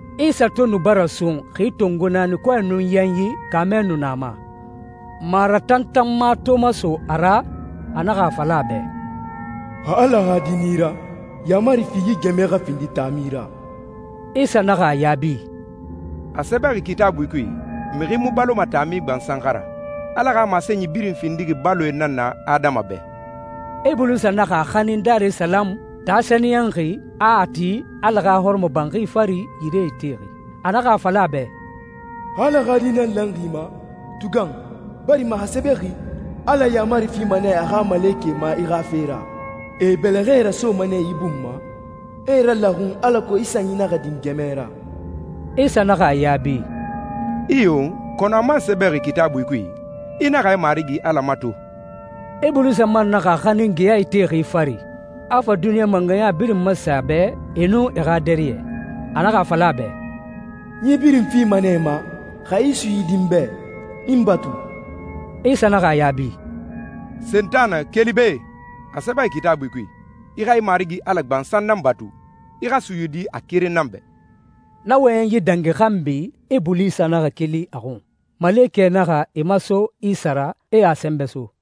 Isa to nu bara sun xi tongo naani, kɔɛ nun yanyi, kaamɛ nu na a ma. Maratantanma to maso a ra, a naxa a fala a bɛ, «Xa Ala xa Di nan i ra, yaamari fi yi gɛmɛe xa findi taami ra.» Isa naxa a yaabi, «A sɛbɛxi Kitaabui kui, ‹Mixi mu baloma taami gbansan xa ra. Ala xa masenyi birin findixi baloe nan na adama bɛ.›» Ibulisa naxa a xanin Darisalamu, taa sɛniyɛnxi, a a ti Ala xa hɔrɔmɔbanxi fari, yire itexi. A naxa a fala a bɛ, «Xa Ala xa Di nan lanxi i ma, tugan, barima a sɛbɛxi, ‹Ala yaamari fima nɛ a xa malekɛe ma i xa fe ra,› ‹e e bɛlɛxɛe rasoma nɛ i bun ma, e i ralaxun alako i sanyi naxa din gɛmɛ ra.›» Isa naxa a yaabi, «Iyo, kɔnɔ a man sɛbɛxi Kitaabui kui, ‹I naxa i Marigi Ala mato.›» Ibulisa man naxa a xanin geya itexi fari, a fa duniɲa mangɛya birin masen a bɛ, e nun e xa dariyɛ. A naxa a fala a bɛ, «N yi birin fima nɛ i ma xa i suyidi n bɛ, i n batu.» Isa naxa a yaabi, «Sentanɛ, keli be! A sɛbɛxi Kitaabui kui, ‹I xa i Marigi Ala gbansan nan batu, i xa suyidi a keren nan bɛ.›» Na wɔyɛnyi dangi xanbi, Ibulisa naxa keli a xun. Malekɛe naxa e maso Isa ra, e a sɛnbɛ so.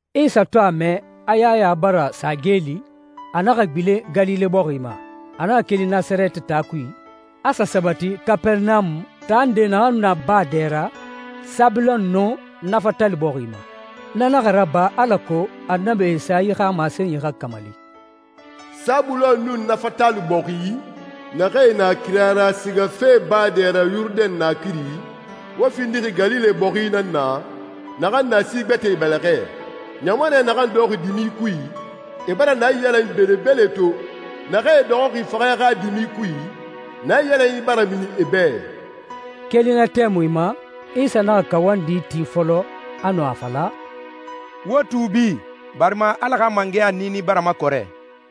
Isa to a mɛ a Yaya bara sa geeli, a naxa gbilen Galile bɔxi ma. A naxa keli Nasarɛti taa kui, a sa sabati Kapɛrɛnamu, taa nde naxan nu na baa dɛ ra, Sabulon nun Nafatali bɔxi ma. Na naxa raba alako Annabi Esayi xa masenyi xa kamali, «Sabulon nun Nafatali bɔxi, naxee na kira ra sigafe baa dɛ ra Yurudɛn naakiri, wo findixi Galile bɔxi nan na naxan na si gbɛtɛe bɛlɛxɛ. Ɲamanɛ naxan dɔxɔxi dimi kui, e bara naiyalanyi belebele to. Naxee dɔxɔxi faxɛ xa dimi kui, naiyalanyi bara mini e bɛ.» Keli na tɛmui ma, Isa naxa kawandi ti fɔlɔ, a nu a fala, «Wo tuubi, barima Ala xa mangɛya niini bara makɔrɛ.»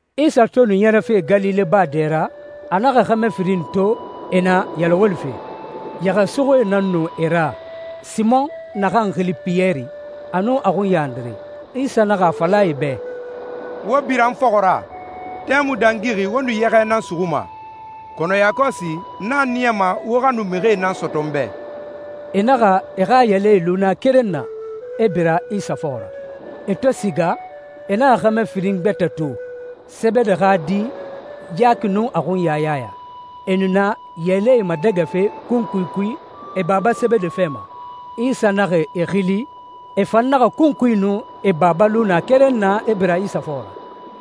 Isa to nu ɲɛrɛfe Galile baa dɛ ra, a naxa xɛmɛ firin to e na yɛlɛ wolife. Yɛxɛsuxuie nan nu e ra, Simɔn, naxan xili Piyɛri, a nun a xunya Andire. Isa naxa a fala e bɛ, «Wo bira n fɔxɔ ra. Tɛmui dangixi wo nu yɛxɛ nan suxuma, kɔnɔ yakɔsi n a niyama wo xa nu mixie nan sɔtɔ n bɛ.» E naxa e xa yɛlɛe lu na keren na, e bira Isa fɔxɔ ra. E to siga, e naxa xɛmɛ firin gbɛtɛ to, Sebede xa di Yaki nun a xunya Yaya. E nu na yɛlɛe madɛgɛfe kunkui kui e baba Sebede fɛ ma. Isa naxa e xili, e fan naxa kunkui nun e baba lu na keren na, e bira Isa fɔxɔ ra.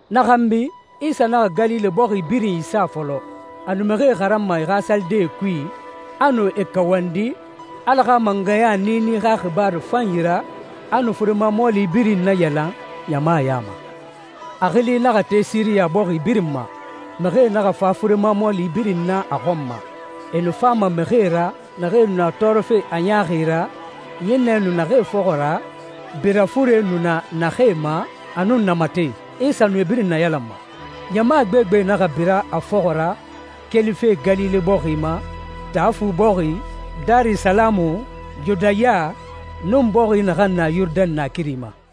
Na xanbi Isa naxa Galile bɔxi birin isa fɔlɔ. A nu mixie xaranma e xa salidee kui, a nu e kawandi Ala xa mangɛya niini xa xibaaru fanyi ra, a nu furema mɔɔli birin nayalan ɲama ya ma. A xili naxa te Siriya bɔxi birin ma. Mixie naxa fa furema mɔɔli birin na a xɔn ma. E nu fama mixie ra naxee nu na tɔɔrɔfe a ɲaaxi ra, ɲinnɛ nu naxee fɔxɔ ra, bira fure nu na naxee ma, a nun namatɛe. Isa nu e birin nayalanma. Ɲama gbegbe naxa bira a fɔxɔ ra kelife Galile bɔxi ma, Taa Fu bɔxi, Darisalamu, Yudaya, nun bɔxi naxan na Yurudɛn naakiri ma.